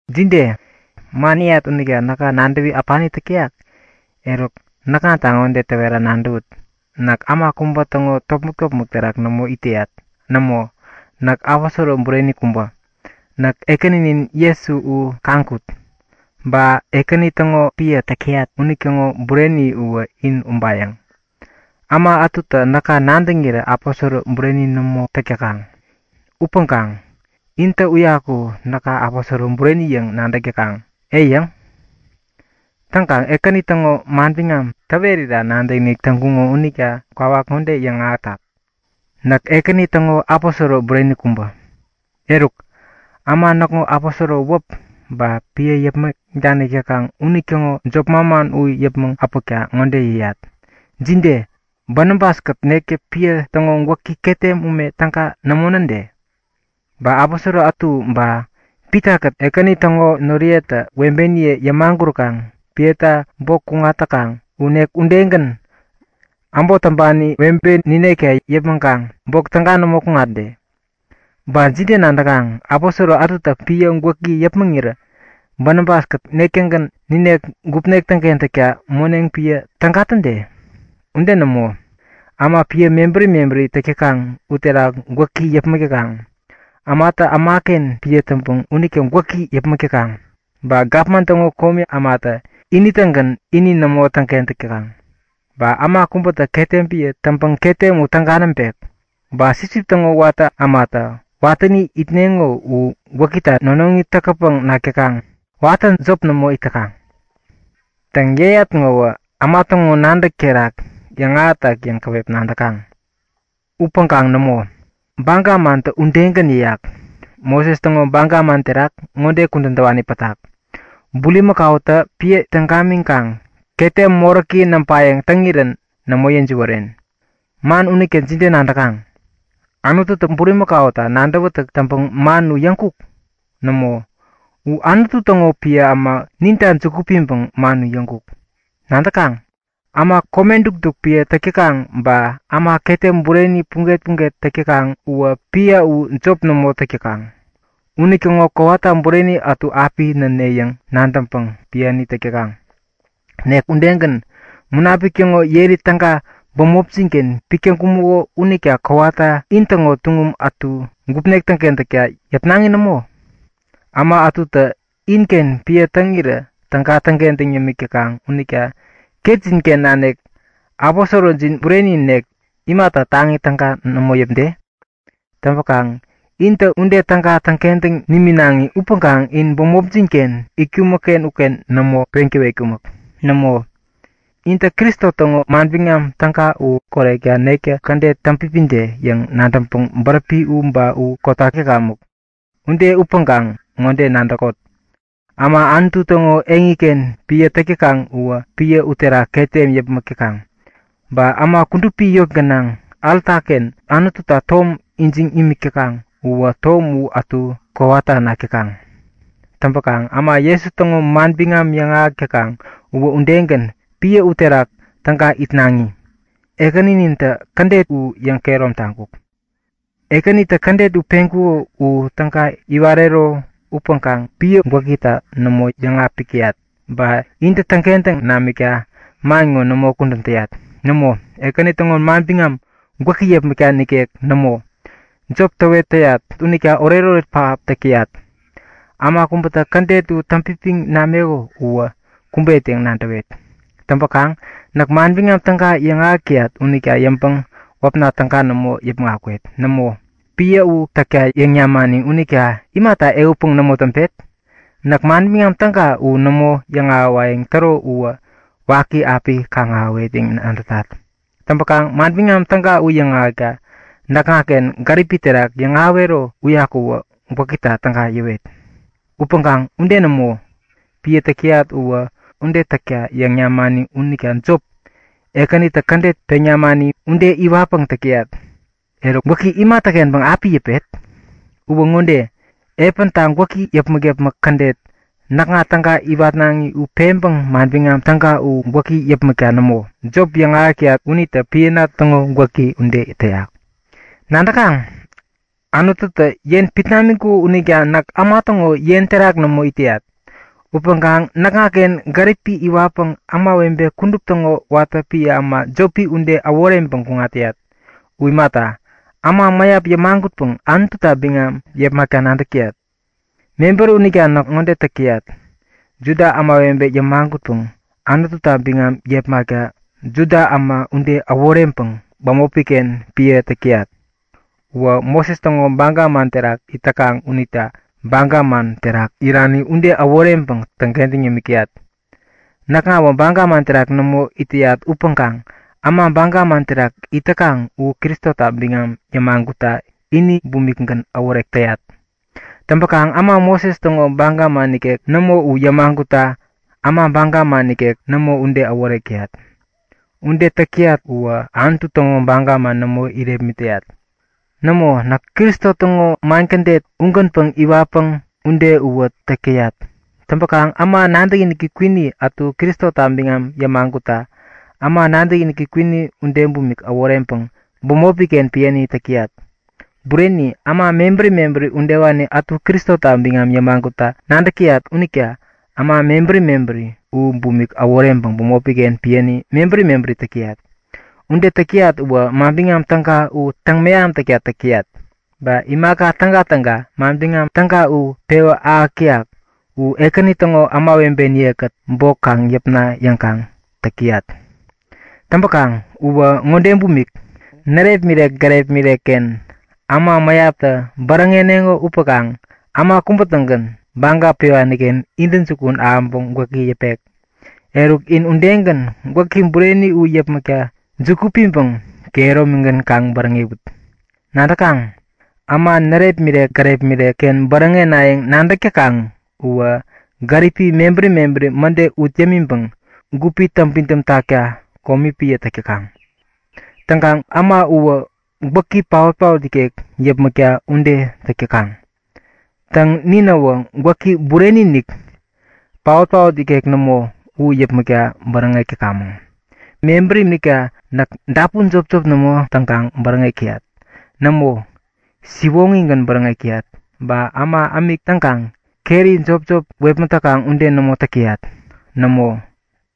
Jide? Man yäyat unita näka nadäwä äpani täk täyak? Eruk näkŋata ŋode täwera nadäwut; Näk äma kubä täŋo topmäk-topmäk terak nämo it täyat. Nämo, näk aposoro bureni kubä. Näk Ekäninin Jesu u kaŋkut. Ba Ekäni täŋo piä täk täyat unitäŋo bureni uwä in ubayäŋ. Äma ätutä näka nadäŋirä aposoro bureni nämo täk täkaŋ. Upäŋkaŋ intä uyaku näka aposoro bureni yäŋ nadäk täkaŋ, ei yäŋ? Täŋkaŋ Ekäni täŋo manbiŋam täwerira nadäkinik täŋkuŋo unitä kwawak ŋode yäŋahätak; Näk Ekäni täŋo aposoro bureni kubä. Eruk, äma näkŋo aposoro wäp ba piä yäpmäŋ danik täkaŋ unitäŋo jop manman u yäpmäŋ äpäkta ŋode yäyat; Jide? Banabas-kät nektä piä täŋo gwäkita ketem ume täga nämo näde? Ba aposoro ätu ba Pitakät Ekäni täŋo noriyetä webeniye yämaguräkaŋ piäta bok kuŋat täkaŋ u, nek udegän, äbot täŋpani webe ninekta yäpmäŋkaŋ bok täga nämo kuŋatne? Ba jide nadäkaŋ? Aposoro ätutä piä gwäki yäpmäŋirä Banabas-kät nek-tägän ninek gupnek täŋkentäkta moneŋ piä täga täde? Ude nämo! Äma piä mebäri mebäri täk täkaŋ uterak gwäki yäpmäk täkaŋ. Ämatä ämaken piä täŋpäŋ unita gwäki yäpmäk täkaŋ. Ba gapman täŋo komi ämatä ini-tägän ini nämo täŋkentäk täkaŋ. Ba äma kubätä ketem piä täŋpäŋ ketem u täga näŋpek. Ba sipsip täŋo watä ämatä watäni itneŋo u gwäkita nonoŋi täkätpäŋ nak täkaŋ. Watä jop nämo it täkaŋ. Täŋ, yäyat ŋowä äma täŋo nadäk terak yäŋahätak yäŋ käwep nadäkaŋ. Upäŋkaŋ nämo, baga mantä udegän yäyak. Moses täŋo baga man terak ŋode kudän täwani pätak; Bulimäkautä piä täŋ gamiŋkaŋ ketem moräki näŋpayäŋ täŋirän nämo yäjiwären. Man unita jide nadäkaŋ? Anututä bulimakauta nadäwätäk täŋpäŋ man u yäŋkuk? Nämo, u Anutu täŋo piä äma ninta juku piŋpäŋ man u yäŋkuk. Nadäkaŋ, äma kome dukduk piä täk täkaŋ ba äma ketem bureni puget-puget täk täkaŋ uwä piä u jop nämo täk täkaŋ. Unitäŋo kowata bureni ätu api näne yäŋ nadäŋpäŋ piäni täk täkaŋ. Nek udegän. Munapik täŋo yeri täga bämopjin-ken pik täŋkumäko unita kowata intäŋo tuŋum ätu gupnek täŋkentäkta yäpnaŋi nämo? Äma ätutä inken piä täŋirä täga täŋkentäŋ yämik täkaŋ unita ketjin-ken nanik aposorojin bureni nek imata taŋi täga nämo yäpde? Täŋpäkaŋ intä ude täga täŋkentäŋ niminaŋi upäŋkaŋ in bämopjin-ken itkumäkken uken nämo peŋ täwetkumäk. Nämo, intä Kristo täŋo Manbiŋam Täga u korekta nektä kädet täŋpipide yäŋ nadäŋpäŋ bäräpi u ba u kotak täkamäk. Ude upäŋkaŋ ŋode nadäkot; Äma Anutu täŋo eŋiken piä täk täkaŋ uwä piä uterak ketem yäpmäk täkaŋ. Ba äma kudupi yot gänaŋ alta-ken Anututa tom ijiŋ imik täkaŋ uwä tom u ätu kowata nak täkaŋ. Täŋpäkaŋ äma Jesu täŋo manbiŋam yäŋahäk täkaŋ uwä udegän, piä uterak täga itnaŋi. Ekäninintä kädet u yäŋkehärom taŋkuk. Ekänitä kädet u peŋkuko u täga iwarero upäŋkaŋ piä gwäkita nämo yäŋapik täyat. Ba intä täŋkentäŋ namikta man ŋo nämo kudän täyat. Nämo, Ekäni täŋo manbiŋam gwäki yäpmäkta nikek nämo, jop täwet täyat unita oretoret pähap täk täyat. Äma kubätä kädet u täŋpipiŋ nameko uwä kumbet yäŋ nadäwet. Täŋpäkaŋ näk Manbiŋam Täga yäŋahäk täyat unita yäŋpäŋ wäpna täga nämo yäpmäŋ akwet. Nämo, piä u täkta yäŋ namani unita imata ehutpäŋ nämo täŋpet? Näk Manbiŋam Täga u nämo yäŋahäwayäŋ täro uwä waki api kaŋ-ahäwet yäŋ nadätat. Täŋpäkaŋ Manbiŋam Täga u yäŋahäkta näkŋaken gärip terak yäŋahäwero uyaku gwäkita täga yäwet. Upäŋkaŋ ude nämo, piä täk täyat uwä ude täkta yäŋ namani unita jop, Ekänitä kädet peŋ namani ude iwatpäŋ täk täyat. Eruk, gwäki imatäkenpäŋ api yäpet? Uwä ŋode; Epänta gwäki yäpmäk-yäpmäk kädet näkŋa täga iwatnaŋi u peŋpäŋ Manbiŋam Täga u gwäki yäpmäkta nämo, jop yäŋahäk täyat unitä piäna täŋo gwäki ude täyak. Nadäkaŋ? Anututä yen pit namiŋkuko unita näk äma täŋo yen terak nämo it täyat. Upäŋkaŋ näkŋaken gärip iwatpäŋ ämawebe kudup täŋo watä piä äma jopi ude äworeŋpäŋ kuŋat täyat. U imata, äma mäyap yämagutpäŋ Anututa biŋam yepmakta nadäk täyat. Mebäri unita näk ŋode täk täyat; Juda ämawebe yämagutpäŋ Anututa biŋam yepmakta Juda äma ude äworeŋpäŋ bämopi-ken piäni täk täyat. Uwä Moses täŋo baga man terak it täkaŋ unita baga man terak irani ude äworeŋpäŋ täŋkentäŋ yämik täyat. Näkŋawä baga man terak nämo it täyat upäŋkaŋ äma baga man terak it täkaŋ u Kristota biŋam yämagutta ini bumikgän äworek täyat. Täŋkaŋ äma Moses täŋo baga man nikek nämo u yämagutta äma baga man nikek nämo ude äworek täyat. Ude täk täyat uwä Anutu täŋo baga nämo irepmit täyat. Nämo, näk Kristo täŋo man kädet ugän iwatpäŋ ude uwä täk täyat. Täŋkaŋ äma nadäkiniki kwini ätu Kristota biŋam yämagutta, äma nadäkiniki kwini ude bumik äworeŋpäŋ bämopi-ken piäni täk täyat. Bureni, äma mebäri mebäri udewani ätu Kristota biŋam yämagutta nadäk täyat unita äma mebäri mebäri u bumik äworeŋpäŋ bämopi-ken piäni mebäri mebäri täk täyat. Ude täk täyat uwä Manbiŋam Täga u täŋmeham täkta täk täyat. Ba imaka tägatäga Manbiŋam Täga u pewä ahäk täyak u Ekäni täŋo ämawebeniye-kät bok kaŋ yäpna yäŋkaŋ täk täyat. Täŋpäkaŋ uwä ŋode bumik; Närepmirek gärepmirek-ken äma mäyaptä bäräŋeneŋo upäŋkaŋ äma kubä-tägän baga pewani-ken intäjukun ahäŋpäŋ gwäki yäpek. Eruk, in udegän gwäki bureni u yäpmäkta juku piŋpäŋ kehäromigän kaŋ bäräŋewut. Nadäkaŋ, äma närepmirek-gärepmirek-ken bäräŋenayäŋ nadäk täkaŋ uwä gärip mebäri mebäri mäde ut yämiŋpäŋ gupi täŋpidäm takta komi piä täk täkaŋ. Täŋkaŋ äma uwä gwäki paotpaot ikek yäpmäkta ude täk täkaŋ. Täŋ, ninäwä gwäki bureni-inik, paotpaot ikek nämo u yäpmäkta bäräŋek täkamäŋ. Mebäri unita näk dapun jopjop nämo täŋkaŋ bäräŋek täyat. Nämo, siwoŋigän bäräŋek täyat. Ba äma ämik täŋkaŋ keri jopjop wepmät täkaŋ ude nämo täk täyat. Nämo,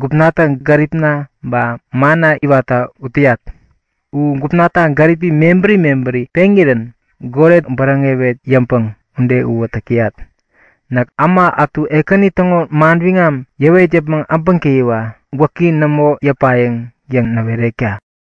gupnatä gäripna ba manna iwatta ut täyat. U gupnatä gärip mebäri mebäri peŋirän goret bäräŋewet yäŋpäŋ ude uwä täk täyat. Näk äma ätu Ekäni täŋo manbiŋam yäwet yäpmäŋ äbäŋtäyiwa gwäki nämo yäpayäŋ yäŋ näwerekta!